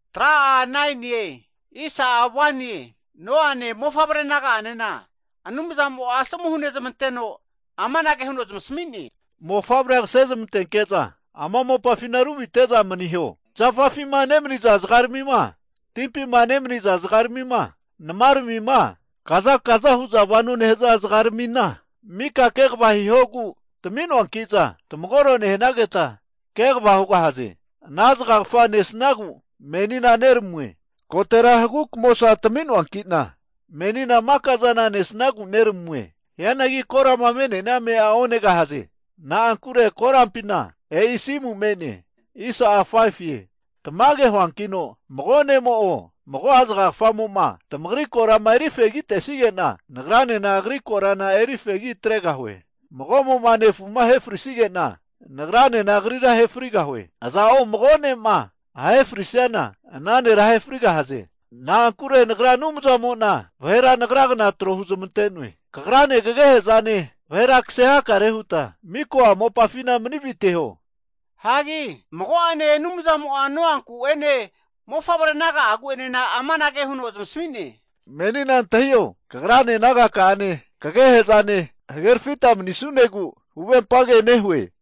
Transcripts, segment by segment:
Anumzamo Noane mofavre naga'ane asomu huzmanteno amanage huno zamasmi'ne, Mofavre kse zamantenke'za ama mopa ruviteho. Zafafi zga, timpi zga, nma, kazakaza nehu'za vano nehza zga mika kva hihogu tmi'noankiza tamagoro nehnageta kva hugahaze. Ana zgagfa nesnagu meni neramue. Kotera hagu' kamosa tmi'noana menina maka'zana nesnagu neramue. Hianagi korama me'nea ame'a onegahaze na'ankure, korampina e'i asimu'a me'ne. Tmage hu'noe mago ne'mo o, mago'a zgagfamoma tamagri korama eri fegima tesigena, Nagranena agri korana eri fegi atregahue. Mago'mo nefu ahe frisnigena, Ngaranena, agrira ahe frigahue. Aza'o mago ne'ma ahe frisiana, ana nera ahe frigahaze. Na'ankure Anumzamo'a vahera Agra gna trohu zamante'ne. Kagrane, kagehe'zane, vahe kse hakare huta miko'a mopafina mani viteho. Rune Anumzamo Noanku'ene, mofavre naga'aguene amanage huno zamasmi'ne, Menina antahio, kagrane, nagaka'ane kagehe'zane hagerfita mani'sunegu huvempage nehue.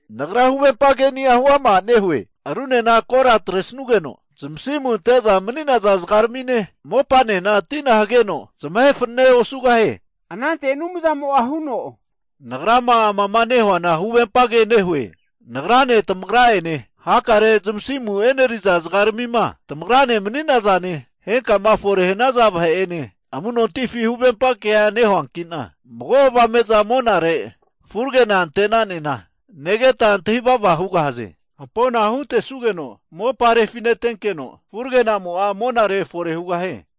Nagra huvempa ke'ni'a huama nehue, arunena ko' tina atresugeno zamasimu ante'za mani'naza zgarmine, mopane, tina hageno zamahe fanane osugahie. Anumzamo hu'ne, Nagra amama nehuana huvempa ke nehue, Nagrane, tamagra ene hakare zamasimu eneriza zgarmima tamagrane mani'nazane, henkama fore'ma hnaza vahe'ene amu'nontifi huvempa ke nehuankina, avame'za monare furagena ante'nanena negeta antahi vava hugahaze. Hampona huntesugeno mopa reganeginkeno, hagi furagenamo monare fore hugahie.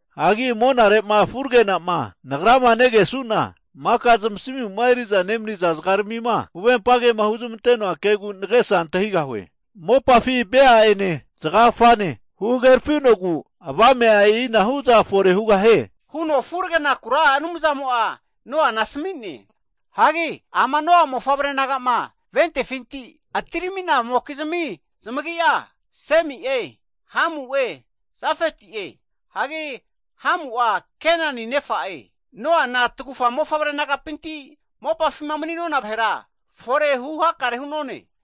Nagra monare'ma furage'na kesu'na huvempa kema zgagfagu'ma hunteno'a kegu nagesa antahigahue. Mopafi vea'ene zgagfane hagerfinogu avame'a e'inahuza fore hugahie, huno furagenaku Anumzamo Noana asmi'ne. Noa mofavre nagama ventefinti atirminazamokizmi zamagi'a Semi'e, Hamu'e Jafeti'e. Hagi Hamu'a Kenani, nefa'e. Noana tagufa mofavre nagapinti mopafima mani'nona vahera, forehu hakare hu'none.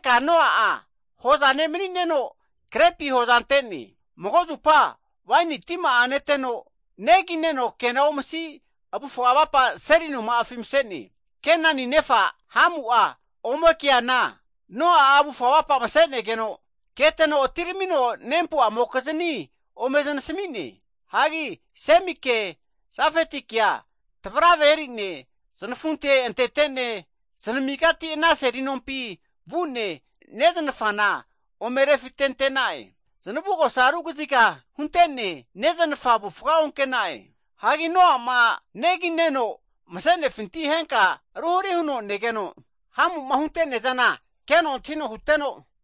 Noa'a hoza ne manineno krepi hoza ante'ne. Mago'zupa waeni tima'a neteno negi neno kena omsi avufga avapa seli noma'afi mse'ne. Kenani nefa Hamu'a ome keana Noa'a avufa avapa mse'negeno keteno atiramino nempu'amokizni ome znasmi'ne. Ome znasmigene, Semike, Jafetikea tavrave eri'ne znafunte antetene znamigati ana seli nompi vu'ne, neznafa'na ome rufitentena'e. Znavugosa arugziga huntene neznafa avufga onkena'e. Hagi Noa'ma negineno mse'nefinti henka ruhri huno negeno Hamu'ma hunte'neazana keno antahino huteno,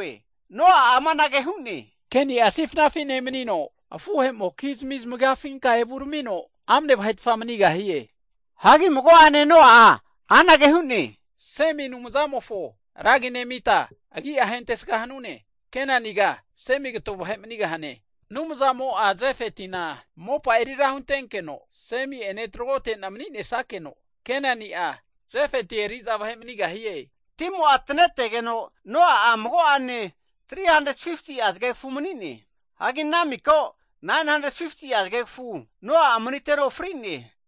Noa'a amanage hu'ne, Kenia sifnafi nemanino, afuhemokizmi zamagafinka evu ramino amane eri'za vahe'zmi mani'gahie. Hanki Noa'a hu'ne, Semi Anumzamofo ra agi nemita agi'a eri'sga hanune. Kenaniga, Semi kato vahe mani'gahane. Anumzamo, Jafetina, mopa'a erira huntenkeno Semi'ene tragotene mani'ne snakeno Kenani'a, Jafeti eri'za vahe manigahie. Timo tanetegeno Noa'a mago'ane 350ti'a zgegfu mani'ne. Hagi ana mika zgegfu'a 950ti'a zgegfu Noa'a maniteno fri'ne.